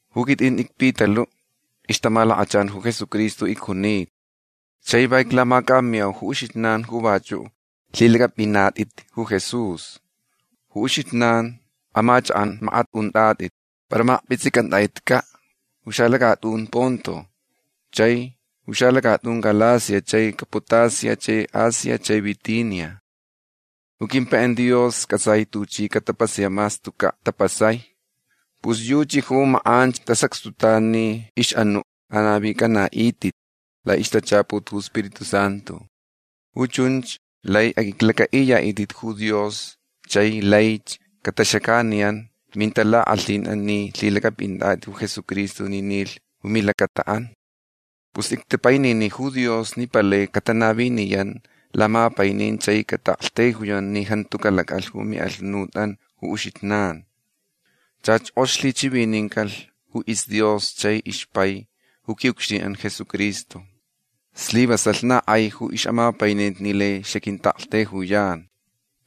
Ju quitʼin icPitaluʼ. Ixtamalakachan ju Jesucristo icjunita. Chai va iclamacʼamiyau ju uxijnan ju vachuʼ lhilacʼapʼinatʼit ju Jesús. Ju uxijnan amachakʼan makat untʼatʼit para makpʼitsʼicʼantʼatʼitcaʼ ju xalacatʼun Ponto chai ju xalacatʼun Galacia chai Capadocia chai Asia chai Bitinia. Ju quimpaiʼan Dios cʼatsai tuchi catapasayaʼ mas tucaʼ tapasai. Pus yuchi ju makʼanch tasacxtutan ni ixʼanuʼ anavicʼanaʼitʼit laʼixtachaput ju Spiritu Santu. Ju chunch lai aqʼuiclacʼaʼiyaʼitʼit ju Dios chai laich cataxacaniyan mintalakʼalhinʼan ni lhilacʼapʼinatʼit ju Jesucristo ni nilh ju milacataʼan. Pus ictapainini ju Dios ni palai catanaviniyan lamapainin chai cataʼaktaijuyan ni jantu calacʼalh ju miʼalhunutʼan ju uxijnan. Chach kʼox lhichivinincalh ju isDios chai ixpai ju quiʼucxtinʼan Jesucristo. Slivasalh na kʼai ju ixʼamapaininti ni lai xaquintaʼaktaijuyan.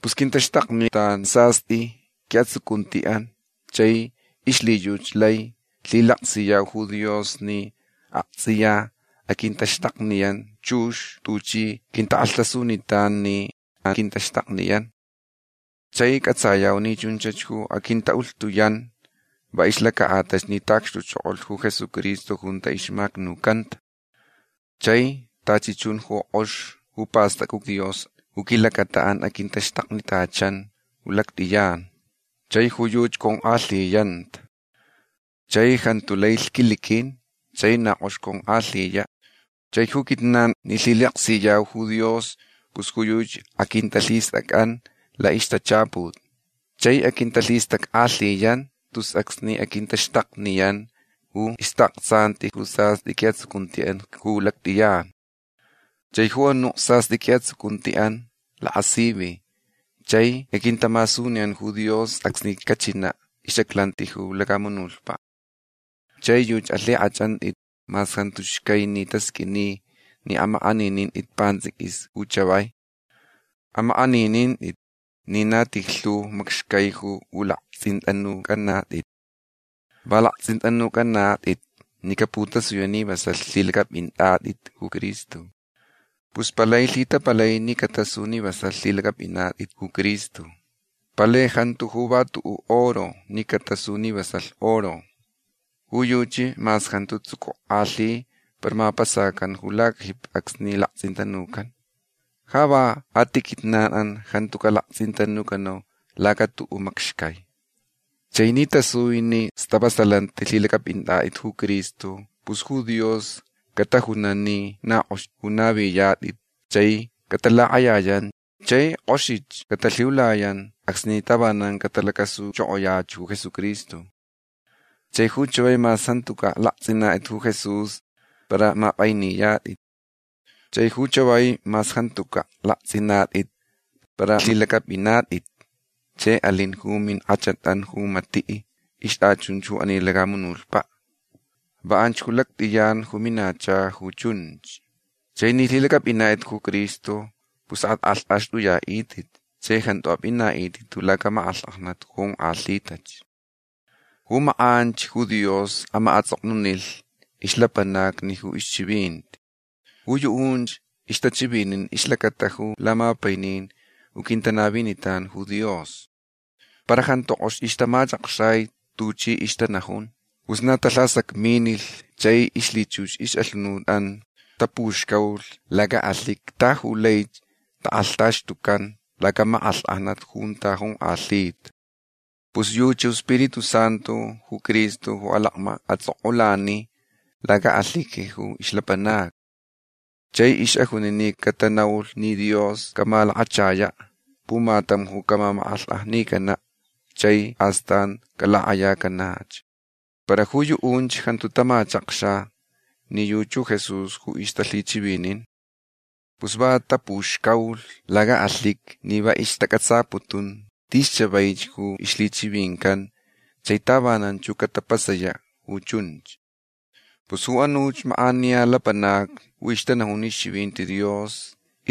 Pus quintaxtaknitan sastʼi quiʼatsucuntiʼan chai ixlhiyuchi lai lhilaksiyau ju Dios ni aktsʼiya aquintaxtakniyanch chux tuchi quintakʼalhtasunitan ni aquintaxtakniyan. Chai cʼatsayau ni chunch ju aquintaʼulhtuyan va ixlacaʼatalh ni taʼacxtuchokolh ju Jesucristo junta ixmacnucanta. Chai tachi chun ju kʼox ju pastacta ju Dios ju quilacataʼan aquintaxtaknitachan ju lactʼiyan. Chai ju yuchi conkʼalhiyanta. Chai jantu lai lhquiliquin chai na kʼox conkʼalhiyaʼ. Chai ju quijnan ni lhilaksiyau ju Dios pus ju yuchi aquintalhistʼacʼan laʼixtachaput. Chai aquintalhistackʼalhiyan tus acsni aquintaxtakniyan ju ixtaʼaktsanti ju sastʼi quiʼatsucuntiʼan ju lactʼiyan. Chai ju anuʼ sastʼi quiʼatsucuntiʼan lakasivi chai aquintamasuniyan ju Dios acsni cachinaʼ ixʼaclanti ju lacamunutpaʼ. Chai yuchi alhikʼachʼantʼit mas jantu xcai ni tasqʼuini ni amakʼaninintʼit pantsʼiquis ju chavai. Amakʼaninintʼit ni na tijlhu macxcai ju pʼulaktsʼintʼanucʼanatʼit. Va laktsʼintʼanucʼanatʼit ni caputasuyach ni vasalh lhilacʼapʼinatʼit ju Cristo. Pus palai lhitapalai ni catasu ni vasalh lhilacʼapʼinatʼit ju Cristo. Palai jantu ju va tuʼuʼ oro ni catasu ni vasalh oro. Ju yuchi mas jantu tsucukʼalhi para mapasacan ju lacajipi acsni laktsʼintanucan. Ja va a ti quijnanʼan jantu calaktsʼintanucanau laca tuʼuʼ macxcai. Chai ni tasui ni stavasalanti lhilacʼapʼinatʼit ju Cristo pus ju Dios catajunan ni na kʼox ju navitʼatʼit chai catalakʼayayan chai kʼoxich catalhiulayan acsni tavanan catalacasuchokoyach ju Jesucristo. Chai ju chavai mas jantucaʼ laktsʼinatʼit ju Jesús para mapʼainiyatʼit. Chai ju chavai mas jantucaʼ laktsʼinatʼit para lhilacʼapʼinatʼit chai alin ju minkʼachatʼan ju matiʼ ixtʼachunch ju ani lacamunutpaʼ. Va anch ju lactʼiyan ju minacha ju chunch. Chai ni lhilacʼapʼinatʼit ju Cristo pus atʼakʼalhtʼaxtʼuyaʼitʼit chai jantu apʼinaʼitʼit ju lacamakʼalhkʼajnat ju jonkʼalhitach. Ju makʼanch ju Dios amaʼatsʼoknunilh ixlapanacni ju ixchivinti. Ju yuʼunch ixtachivinin ixlacata ju lamapainin ju quintanavinitan ju Dios. Para jantu kʼox ixtamachakxai tuchi ixtanajun. Pus na talhasacminilh chai ixlhichux ixʼalhunutʼan tapuxcaulhch lacaʼalhiqui ta yu laich takʼalhtaxtucan lacamakʼalhkʼajnat junta jonkʼalhita. Pus yuchi ju iSpiritu Santu ju Cristo ju alacmaʼatsʼokʼulani lacaʼalhiqui ju ixlapanacni. Chai ixʼajuni ni catanaulh ni Dios camalakachayaʼ pumatam ju camamakʼalhkʼajnicanaʼ chai astan calakʼayacanach. Para ju yuʼunch jantu tamachakxa ni yuchi ju Jesús ju ixtalhichivinin. Pus va tapuxcaulh lacaʼalhiqui ni va ixtacʼatsaputun tis chavaich ju ixlhichivincan chai tavananch ju catapasayaʼ ju chunch. Pus ju anuch makʼaniya lapanacni ju ixtanajun ixchivinti Dios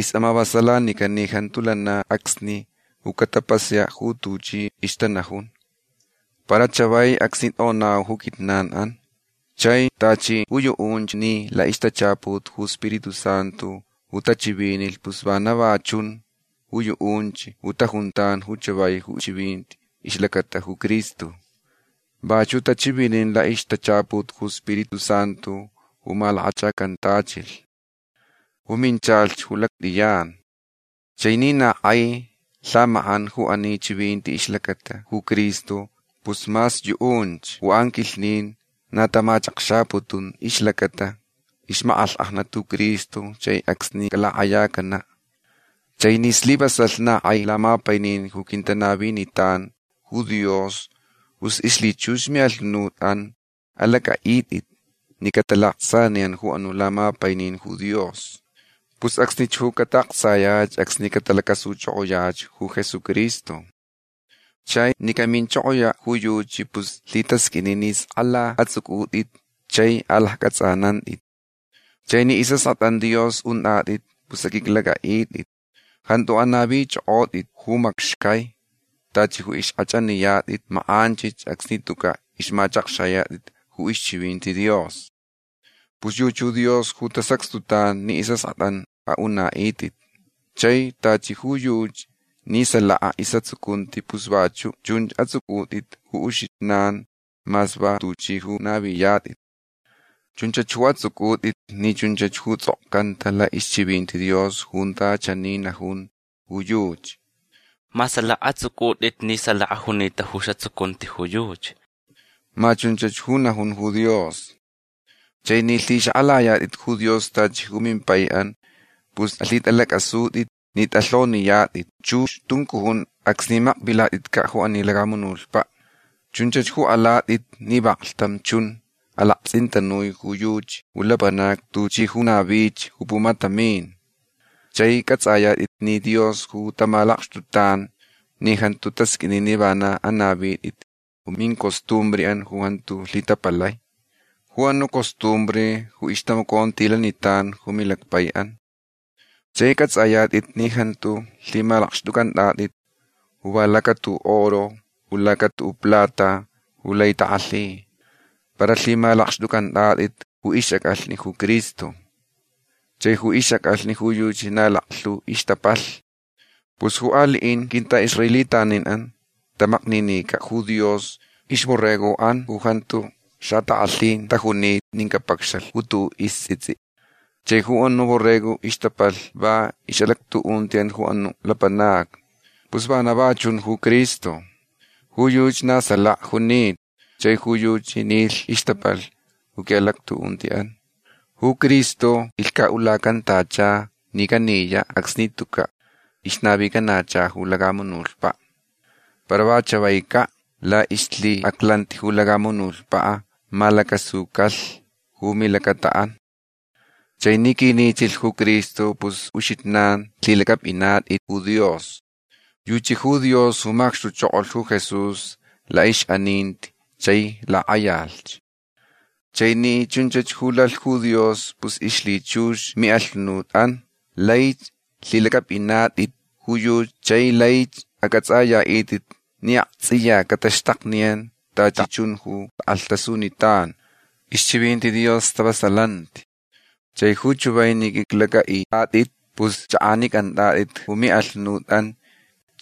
ixʼamavasalanican ni jantu lana acsni ju catapasayaʼ ju tuchi ixtanajun. Para chavai acsni tʼonau ju quijnanʼan. Chai tachi ju yuʼunch ni laʼixtachaput ju Spiritu Santu ju tachivinilh pus vana va chun ju yuʼunch ju tajuntan ju chavai ju chivinti ixlacata ju Cristo. Vachuʼ tachivinin laʼixtachaput ju Spiritu Santu ju malakachacantachilh. Ju minchalh ju lactʼiyan. Chai ni na kʼai lhamakʼan ju ani chivinti ixlacata ju Cristo pus mas yuʼunch ju anquilhnin na tamachakxaputun ixlacata ixmakʼalhkʼajnat ju Cristo chai acsni calakʼayacanaʼ. Chai ni slivasalh na kʼai lamapainin ju quintanavinitan ju Dios pus ixlhichux miʼalhunutʼan alacʼaʼitʼit ni catalaktsʼaniyan ju anuʼ lamapainin ju Dios. Pus acsnich ju cataʼaktsayach acsni catalacasuchokoyach ju Jesucristo. Chai ni caminchokoyaʼ ju yuchi pus lhitasqʼuini ni skʼala atsʼucʼutʼit chai alaccʼatsʼanantʼit. Chai ni isʼaskʼatʼan Dios untʼatʼit pus aqʼuiclacʼaʼitʼit. Jantu anavichʼokʼotʼit ju macxcai tachi ju ixkʼachʼaniyatʼit makʼanchich acsni tucaʼ ixmachʼakxayatʼit ju ixchivinti Dios. Pus yuchi ju Dios ju tasacxtutan ni isʼaskʼatʼan aʼunaʼitʼit. Chai tachi ju yuchi ni salaka isʼatsucunti pus vachuʼ chunch atsʼucʼutʼit ju uxijnan mas va tuchi ju naviyatʼit. Chunchach ju atsʼucʼutʼit ni chunchach ju tsʼokcanta laʼixchivinti Dios junta chani najun ju yuchi: “Ma salaka atsʼucʼutʼit ni salaka junita ju isʼatsucunti ju yuchi”. Ma chunch ju najun ju Dios. Chai ni lhixakʼalayatʼit ju Dios tachi ju mimpaiʼan pus alhitʼalacʼasutʼitch ni tʼalhoniyatʼit chux tuncujun acsni makvilatʼitcaʼ ju ani lacamunutpaʼ. Chunch ju alatʼit ni vaklhtam chun alaktsʼintanui ju yuchi ju lapanacni tuchi ju navich ju pumatamin. Chai cʼatsʼayatʼit ni Dios ju tamalakxtutan ni jantu tasqʼuini ni vana anavitʼit ju mincostumbreʼan ju jantu lhitapalai. Ju anuʼ costumbre ju ixtamacontilanitan ju milacpaiʼan. Chai cʼatsʼayatʼit ni jantu lhimalakxtʼucʼantʼatʼit ju va laca tuʼuʼ oro u laca tuʼuʼ plata ju lai takʼalhi. Para lhimalakxtʼucʼantʼatʼit ju ixʼacʼalhni ju Cristo. Chai ju ixʼacʼalhni ju yuchi na laklhu ixtapalh. Pus ju aliʼin quintʼaʼisraelitaninʼan tamakninicaʼ ju Dios ixborregoʼan ju jantu xatakʼalhin tajunita nin capacxalh ju tuʼuʼ istsʼitsʼi. Chai ju anuʼ borrego ixtapalh va ixʼalactuʼuntiʼan ju anuch lapanacni. Pus vana va chun ju Cristo. Ju yuchi na salaka junita chai ju yuchi nilh ixtapalh ju quiʼalactuʼuntiʼan. Ju Cristo ilhcaʼulacantacha ni caniyaʼ acsni tucaʼ ixnavicanacha ju lacamunutpaʼ. Para va chavaicaʼ laʼixlhiʼaclanti ju lacamunutpaʼ malacasucalh ju milacataʼan. Chai ni quinichilh ju Cristo pus ju uxijnan lhilacʼapʼinatʼit ju Dios. Yuchi ju Dios ju macxtuchokolh ju Jesús laʼixʼaninti chai lakʼayalh. Chai ni chunch ju lalh ju Dios pus ixlhichux miʼalhunutʼan laich lhilacʼapʼinatʼit ju yuchi chai laich acʼatsʼayaʼitʼit ni aktsʼiya cataxtakniyan tachi chun ju takʼalhtasunitan. Ixchivinti Dios stavasalanti. Chai ju chavai ni qʼuiclacʼaʼitʼatʼit pus chʼakʼanicʼantʼatʼit ju miʼalhunutʼan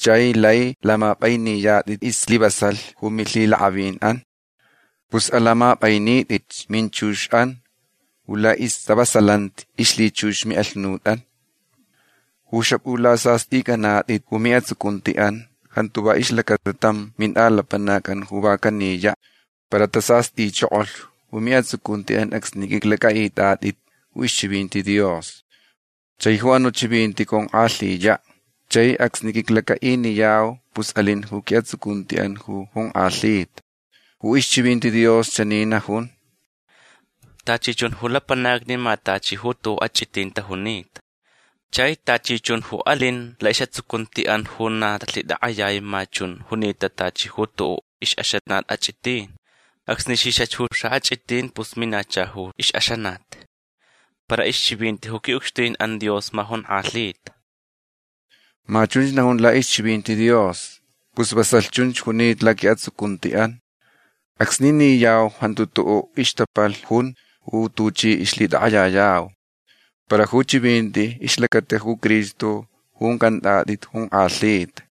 chai lai lamapʼainiyatʼit islivasalh ju milhiʼalakʼavinʼan. Pus alamapʼainitʼitch minchuxʼan ju laʼistavasalanti ixlhichux miʼalhunutʼan. Ju xapʼulasastʼinicʼanatʼit ju miʼatsucuntiʼan jantu va ixlacata tam mintʼalapanacʼan ju va caniyaʼ. Para tasastʼichokolh ju miʼatsucuntiʼan acsni qʼuiclacʼaʼitʼatʼit ju ixchivinti Dios. Chai ju anuʼ chivinti conkʼalhiyach. Chai acsni quiclacaʼiniyau pus alin ju quiʼatsucuntiʼan ju jonkʼalhita. Ju ixchivinti Dios chani najun: Tachi chun ju lapanacni ma tachi ju tuʼuʼ achʼitin tajunita. Chai tachi chun ju alin laʼisʼatsucuntiʼan ju na talhitakʼayai ma chunch junita tachi ju tuʼuʼ ixʼaxanat achʼitin. Acsni xixach ju xaʼachʼitin pus minacha ju ixʼaxanat. Para ixchivinti ju quiʼucxtinʼan Dios ma jonkʼalhita. Ma chunch najun laʼixchivinti Dios. Pus vasalh chunch junita laquiʼatsucuntiʼan. Acsni niyau jantu tuʼuʼ ixtapalh jun ju tuchi ixlhitakʼayayau. Para ju chivinti ixlacata ju Cristo ju uncʼantʼatʼit jonkʼalhita.